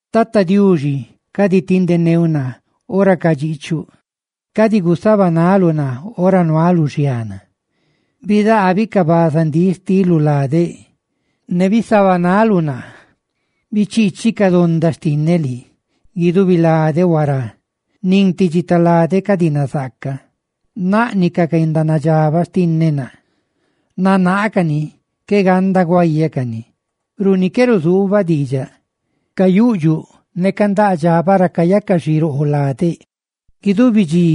Tata Diuxi, cadi tindeneuꞌ naa ora cadxiꞌchuꞌ, ne cadi gusabanaluꞌ naa ora nualuꞌ xiana. Bidaabi ca bazandíꞌ xtiluꞌ ladeꞌ; ¡ne bisabanaluꞌ naa! Bichiichi ca donda xtinneꞌ lii, guidubi ladeꞌ huará; ¡nin ti dxitaladeꞌ cadi nazaaca! Naꞌniꞌ ca guendanadxabaꞌ xtinneꞌ naa; nanaacani, qué ganda guáyacani. Runi qué ruzuubaꞌ diidxaꞌ, cayuꞌdxuꞌ ne candaꞌ dxabaꞌ ra cayaca xiroo ladeꞌ. Guidubi dxi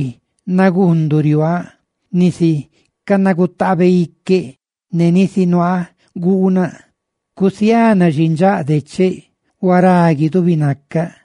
naguunduꞌ riuaaꞌ, nisi canagutaabeꞌ iqueꞌ ne nisi nuaa guunaꞌ. Cusiana xindxaꞌ decheꞌ; ¡huará guidubi nacaꞌ!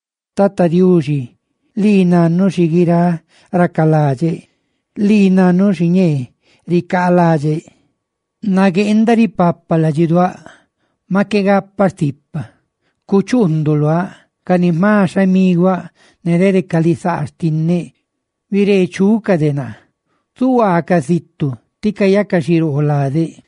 Tata Diuxi lii nannuꞌ xi guiráꞌ racalaꞌdxeꞌ, ¡lii nannuꞌ xiñee ricaalaꞌdxeꞌ! Nagueenda ripapa ladxiduáꞌ, maꞌ qué gapaꞌ stipa, ¡cachuunduꞌ luáꞌ! Ca ni jma xhamiguaꞌ ne dede ca lisaa xtinneꞌ, bireechucaꞌ de naa zuhuaacaꞌ zitu, ti cayaca xiroo ladeꞌ.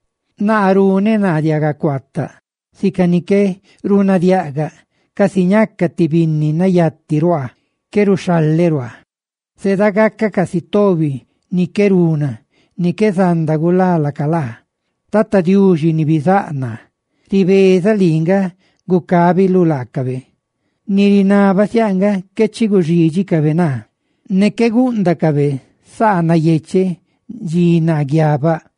Naa runeꞌ naa diagacuaataꞌ, sica ni qué runadiaga; casi ñacaꞌ ti binni nayati ruaa, qué ruxhaleꞌ ruaaꞌ. Zedagacaꞌ casi tobi ni qué runa ni qué zanda gulá laca laa. Ribeeza, Tata Diuxi ni bizáꞌ naa, lii nga gucábiluꞌ laacabe. Ni rinabaꞌ siáꞌ nga qué chi guxídxicabe naa, ne qué gúꞌndacabe saa nayecheꞌ dxi naa guiabaꞌ.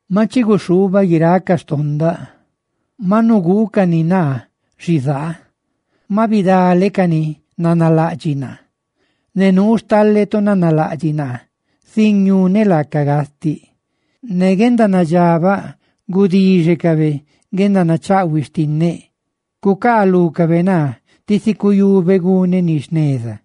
¡Maꞌ chi guxhuubaꞌ guiráꞌ ca xtondaꞌ, maꞌ nuguucani naa xizaa! Maꞌ bidale ca ni nanalaꞌdxiꞌ naa; ne nuu stale tu nanalaꞌdxiꞌ naa sin ñune laacaꞌ gastiꞌ. Ne guendanadxabaꞌ gudixecabe guendanachaꞌhuiꞌ xtinneꞌ; cucaalúcabe naa tisi cuyube guneꞌ ni jneza.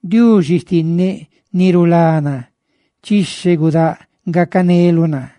Diuxi xtinneꞌ ni rulá naa, ¡chixhe gudáꞌ gacaneluꞌ naa!